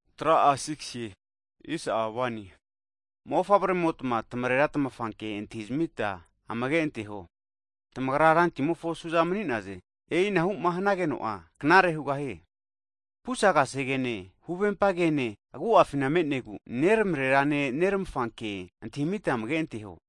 Hagi mofavremotma, tamarera tamafa kea antahizmita amage anteho, tamagra Rantimofo suza mani'naze. E'inahu'ma hanageno'a knare hugahie. Pusa kasegefina, huvempa ke'ne agu'afina me'negu, neramrerane neramafa ke antahita amage anteho.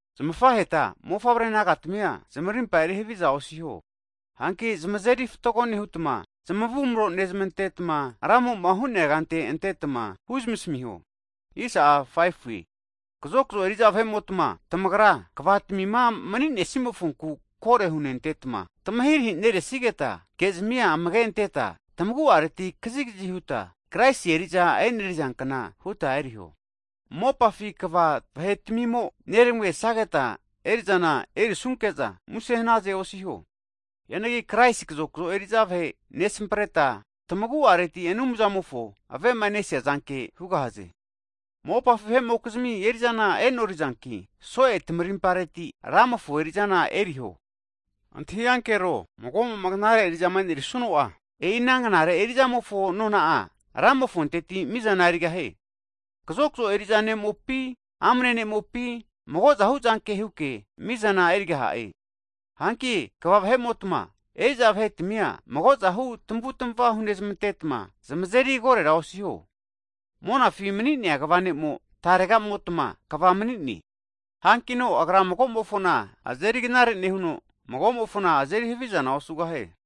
Zamafaheta mofavre nagatmia zamarimpa eri haviza osiho, hanki zamazeri fatgo nehutma zamavumro nezmantetma, Ramo'ma hu'neankante antetma huzmasmiho. Hagi kazokzo eri'za vahe'motma, tamagra kva tamima mani'nesimofonku kore hunentetma tamahirahi neresigeta kezmia amage anteta, tamagu'areti kazigazi huta, Kraisi eri'za enerizankna huta eriho. Mopafi kva vahe'tmimo'za neramagesageta eri'zana erisunke'za muse hanaze osiho. Hianagi Kraisi kazokzo eri'za vahe nesampreta, tamagu'areti Anumzamofo avemanesia zanke hugahaze. Mopafi vahe'mokizmi eri'zana e'norizanki, so'e tamarimpareti Ramofo eri'zana eriho. Antahi ankero, mago'mo'ma knare eri'zama enerisuno'a, e'i ana knare eri'zamofo nona'a Ramofonteti mizana erigahie. Kazokzo eri'za ne'mopi amne ne'mopi mago'zahu zanke huke mizana erigaha'e. Hanki kva vahe'motama, eri'za vahetmia magozahu tamavutma hunezmantetma, zamazeri korera osiho, monafi nemania kva ne'mo tarega'motma kva mani'ne, hankino Agra mago'mofona azeri knare nehuno, mago'mofona azeri havizana osugahie.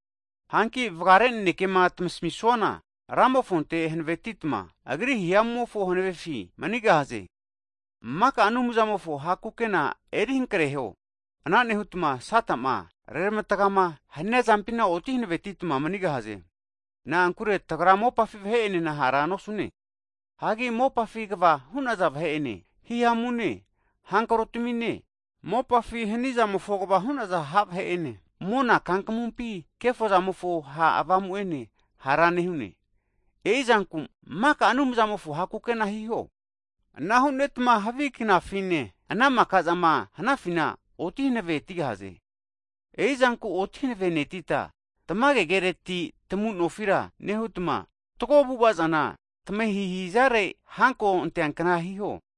Hanki vagare nanekema tamasmisuana, Ramofonte hanavetitma Agri hihamu'mofo hanavefi manigahaze. Maka Anumzamofo ha' kukena eri hankreho, ana nehutma Sata'ma reramatgama hania zampina oti hanavetitma manigahaze. Na'ankure tagra mopafi vahe'enena hara nosune, hagi mopafi kva hu'naza vahe'ene, hihamune havi avamutamine, mopafi hanizamofo kva hu'naza ha' vahe'ene, mona kankamumpima kefozamofo ha' avamu'ene hara nehune. E'i zanku maka Anumzamofo ha' kukena hiho, ana hu'netma havi knafine ana maka'zama hanafina oti hanave tigahaze. E'i zanku oti hanavenetita, tamage kereti tamu nofira nehutma, fatgo avu'ava'zana tamahihi'zarera hanko antea kna hiho.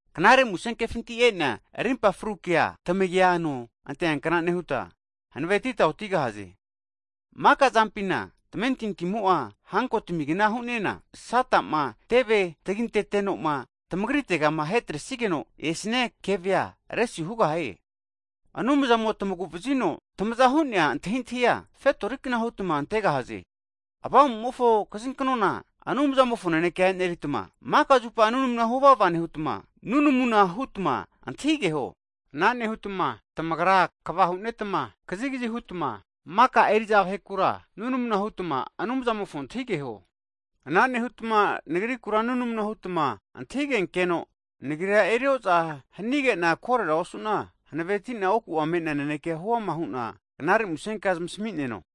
Knare Musenkefinti e'nea rimpa fru kea, tamagia ano anteakna nehuta, hanavetita otigahaze. Maka zampina, tamentintimo'a hanko tamigna hu'nena, Sata'ma teve taginteno'ma tamagritega ahetresigeno esnia kevea resu hugahie. Anumzamo'ma tamagu'vazino tamazahu'nea antahintahia, fetori kna hutma tamasenirera antegahaze. Avamu'mofo kazinknona Anumzamofo naneke eneritma, maka zupa nunamu huvava nehutma, avamupi nunamuna hutma antahigeho. Ana nehanutma tamagra kva hu'netma kazigazi hutma maka Anumzamofo vahekura (kristen) nunamu hutma Anumzamofona antahigeho. Ana nehutma nagriku nunamu hutma antahigenkeno, nagira erioza hanige'na korera osu'na hanavetina oku'a me'nea naneke huama hu'na Knare Musenkea zamasmi'neno.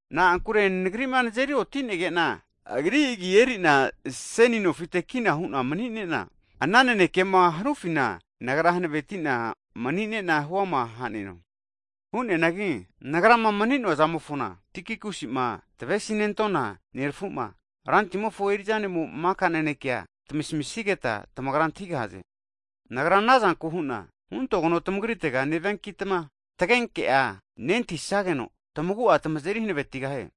Na'ankure nagri'ma nazeri oti'nege'na, Agri agi eri'na seni nofite kina hu'na mani'nena, ana nanekema hanufina nagra hanaveti'na mani'nena huama ha'neno. Hu'neanagi, nagrama mani'noa zamofona, Tikikusima tavesinentona nerafu'ma, Rantimofo eri'za ne'mo maka nanekea tamasmisigeta tamagra antahigahaze. Nagra anazanku hu'na huntogeno tamagritega neviankitma tagenke'a nentahisageno tamagu'a tamazeri hanavetigahie. Hagi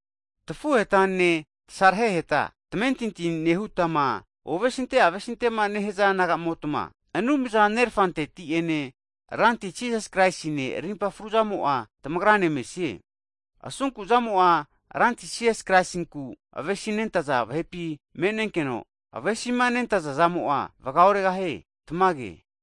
tafuhetane, tasareheta tamamentinti nehutma ovesinte avesintema nehaza naga'motma, Anumza Nerafanteti'ene, Ranti Jisas Kraisine rimpa fruzamo'a tamagrane mesie. Asunku zamo'a Ranti Jisas Kraisinku avesinte vava nehaza vahepi me'nenkeno, avesi'ma nentaza zamo'a vaga oregahie. Tamage.